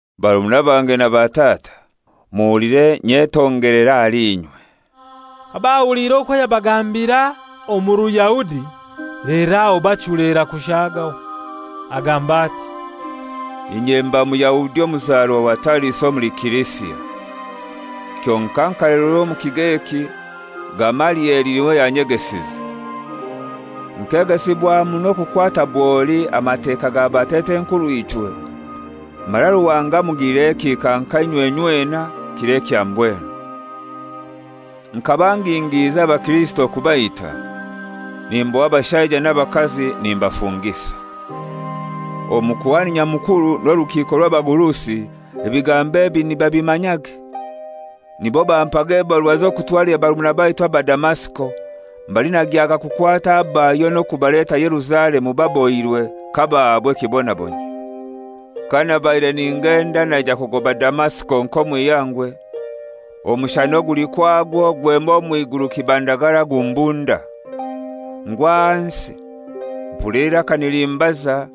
«Barumuna bange na batata, muhulire nyetongelere ahali inywe.» Kabahuliire okwo yabagambira omu Ruyahudi lero aho bachulera kushaagaho. Agamba ati: «Inye mba Muyahudi omuzarwa wa Tariso omuli Silisia. Kyonkai nkalererwa omu kigo eki, Gamalieli n'iwe yanyegesize. Nkegesibwa muno kukwata bwoli Amateka ga batat'enkurw'ichwe, mara Ruhanga mugilira ekihika nka inywe inywena kiro ekya mbwenu. Nkaba ngingiiza Abakirisito kubaita, nimboha abashaija n'abakazi nimbafungisa. Omukuhani Nyamukuru n'orukiiko rw'abagurusi ebigambo ebi nibabimanyage. Nibo bampaga ebarua z'okutwalira barumuna baitu aba Damasiko mbali nagyaga kukwata abayo n'okubaleta Yerusalemu babohirwe kabahaabwa ekibonabonyio. «Kanabaire ningenda naija kugoba Damasiko nk'omu ihangwe, omushana oguli kwagwo gwema omw'iguru kibandagara gumbunda. Ngwa ahansi, mpulira eiraka nilimbaza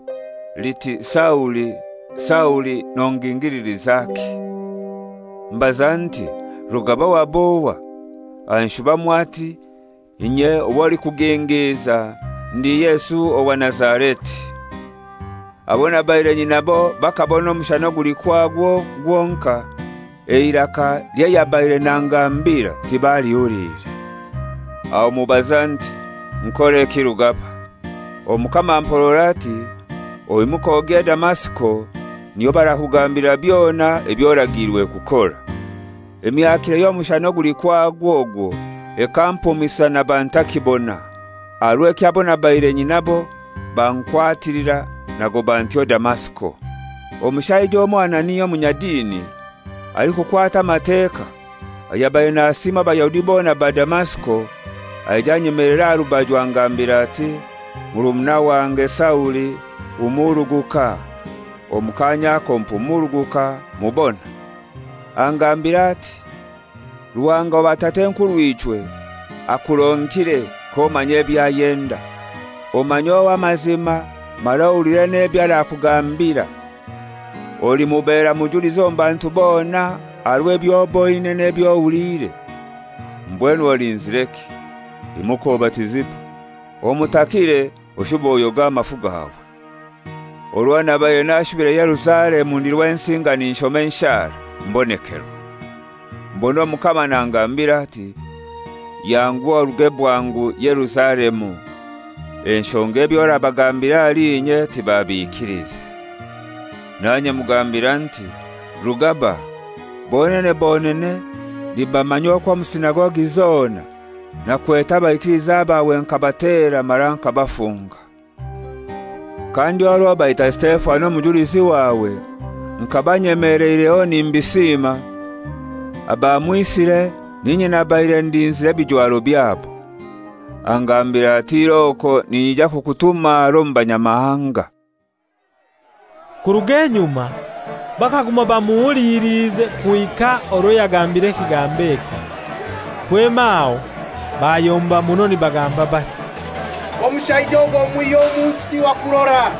liti, ‹Sauli, Sauli, nongingililizaki?› Mbaza nti, ‹Rugaba wab'ohai?› Anshubamu ati, ‹Inye ow'olikugingiiza ndi Yesu owa Nazareti.› Abo nabaire nyinabo bakabona omushana oguli kwagwo gwonkai; eiraka ly'ayabaire nangambira tibalihuliire. Aho mubaza nti, ‹Nkoreki Rugaba?› Omukama amporora ati, ‹Oimuke ogye Damasiko, niyo barakugambilira byona eby'oragiirwe kukora.› Emyakire y'omushana oguli kwagwo ogwo ekampumisa naba ntakibona, aha rw'ekyo abo nabaire nyinabo bankwatilira nagoba ntyo Damasiko. «Omushaija omoi Anania, omunyadini, alikukwata Amateka, ayabaire nasiimwa Abayahudi bona ba Damasiko, aija anyemelera aha rubaju angambira ati, ‹Murumuna wange Sauli, humuruguka.› Omu kaanya ako mpumuruguka, mubona. Angambira ati, ‹Ruhanga wa batat'enkurw'ichwe akuronkire k'omanya eby'ayenda, omanye Ow'amazima mara ohulire n'ebyo arakugambira. Olimubera mujulizi omu bantu bona aha rw'eby'oboine n'eby'ohuliire. Mbwenu olinzireki? Imuka obatizibwe, omutakiire oshube oyoge amafu gawe.› «Orwo nabaire nashubire Yerusalemu ndi Rwensinga ninshoma enshara, mbonekerwa. Mbona Omukama nangambira ati, ‹Yanguha oruge bwangu Yerusalemu enshonga eby'orabagambira ahali inye tibabikiliize.› Nanye mugambira nti, ‹Rugaba, bonene bonene nibamanya okwo omu sinagogi zona nakwete abaikiliza bawe nkabatera mara nkabafunga. Kandi orwo baita Sitefano omujulizi wawe, nkaba nyemeleireho nimbisiima. Abamwisire n'inye nabaire ndinzire ebijwaro byabo.› Angambira ati, ‹Iroko, ninyija kukutuma harai omu Banyamahanga.›» Kurug'enyuma bakaguma bamuhuliliize kuhika orwo yagambiire ekigambo ekyo. Kwema aho bayomba muno nibagamba bati, «Omushaija ogwo mumwihye omu nsi ti wa kurora.»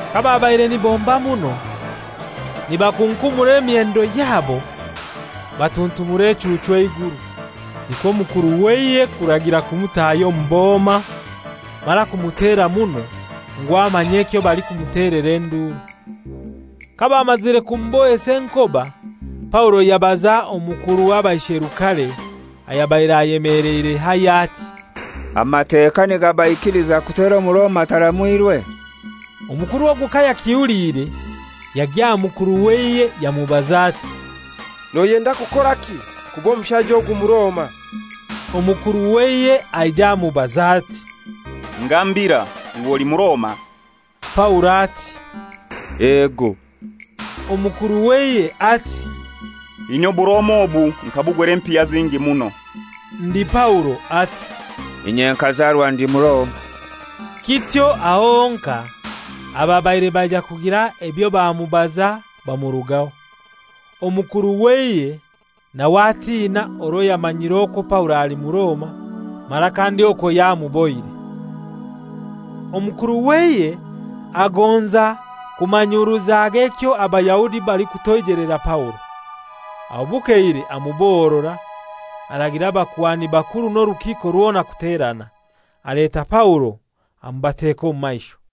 Kababaire nibomba muno, nibakunkumura emyendo yabo, batuntumulira echuuchu eiguru. Nikwo omukuru w'eihe kuragira kumutaahya omu boma mara kumutera muno, ngu amanye ekyo balikumutelera enduru. Kabamazire kumubohesa enkoba, Paulo yabaza omukuru w'abaisherukare ayabaire ayemeleire haihi ati, «Amateka nigabaikiliza kutera Omuroma ataramwirwe?» Omukuru ogwo kayakihuliire yagya aha mukuru w'eihe yamubaza ati, «Noyenda kukoraki? Kuba omushaija ogu Muroma.» Omukuru w'eihe aija amubaza ati, «Ngambira, iwe oli Muroma?» Paulo ati, «Ego.» Omukuru w'eihe ati, «Inye Oburoma obu nkabugura empiya zingi muno.» Ndi Paulo ati, «Inye nkazarwa ndi Muroma.» Kityo aho honkai ababaire baija kugira ebyo bamubaza bamurugaho. Omukuru w'eihe nawe atina orwo yamanyire okwo Paulo ali Muroma, mara kandi okwo yamubohire. Omukuru w'eihe agonza kumanyuruzage ekyo Abayahudi balikutoijelera Paulo. Aho bukeire amubohorora, aragira abakuhani bakuru n'orukiiko rwona kuterana. Aleta Paulo amubateka omu maisho.